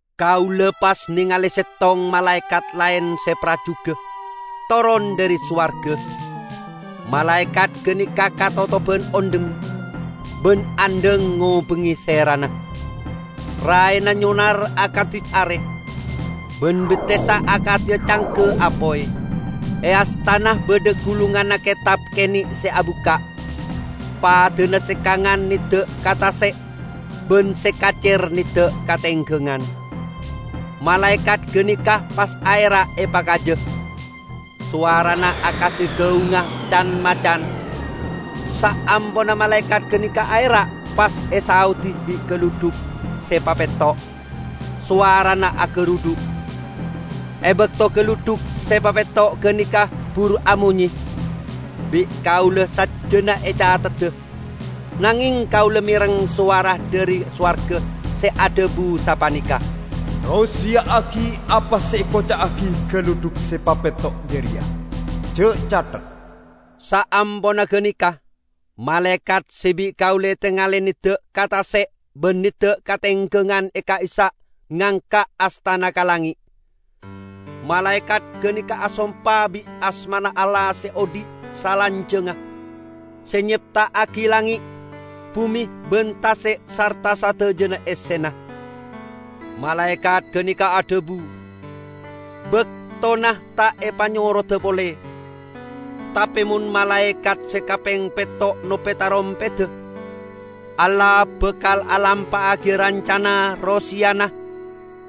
Kaula pas nengale settong malaekat laen se parjuga toron dhari sowarga. Malaekat ganeka katotoban ondhem, ban andhang ngobengnge serana. Raena nyonar akadi are, ban bettessa akadi cangga apoy. E astana badha gulunganna ketab kene' se abukka'. Padana se kangan nedda' ka tase' ban se kacer nedda' ka tenggangan. Malaekat ganeka pas aera' epakaja, sowarana akadi gaungnga can-macan. Saamponna malaekat ganeka aera' pas esaodi bi' galudhuk se papetto', sowarana agarudhu'. E bakto galudhuk se papetto' ganeka buru amonye, bi'kaula sajjana ecathedda, nangeng kaula mereng sowara dhari sowarga se adhabu sapaneka, "Roseya'agi apa se ekoca'agi galudhuk se papetto' jareya, ja' cathet!" Saamponna ganeka, malaekat se bi' kaula etengale nedda' ka tase' ban nedda' ka tenggangan ka'issa' ngangka' astana ka langnge'. Malaekat ganeka asompa bit asmana Allah se odhi' salanjangnga, se nyepta'agi langnge', bume ban tase' sarta sadajana essena. Malaekat ganeka adhabu, "Baktona ta' epanyoroda pole! Tape mon malaekat se kapeng petto nope tarompedda, Allah bakal alampa'agiya rancana roseyana,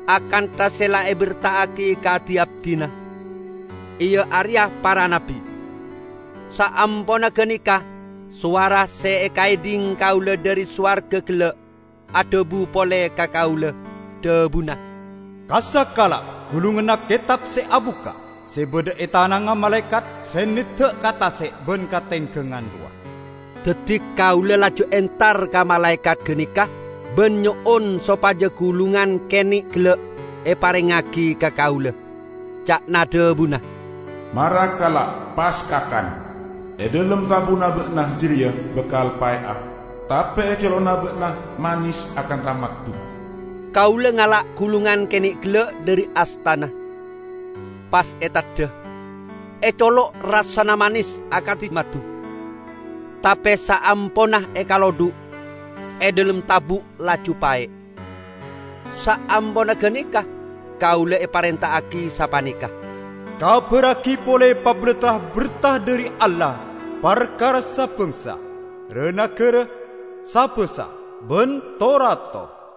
akantha se la eberta'agi ka di-abdina, iya areya para nabbi." Saamponna ganeka, sowara se ekaedhing kaula dhari sowarga gella', adhabu pole ka kaula. Dhabuna, "Kassa' kala' gulunganna ketab se abukka' se badha e tanangnga malaekat se nedda' ka tase' ban ka tenggangan rowa." Daddi kaula laju entar ka malaekat ganeka ban nyo'on sopaja gulungan kene' gella' eparengngagi ka kaula. Ca'na dhabuna, "Mara kala', pas kakan. E dhalem tabu'na ba'na jareya bakal pae'a, tape e colo'na ba'na manes akantha maddu." Kaula ngala' gulungan kene' gella' dhari astana, pas eteddha. E colo' rassana manes akadi maddu, tape saamponna ekalodhu', e dhalem tabu' laju pae'. Saamponna ganeka kaula eparenta'agi sapaneka, "Kabarragi pole pabalattra berta dhari Allah parkara sa-bangsa, ra-nagara, sa-basa ban to-rato."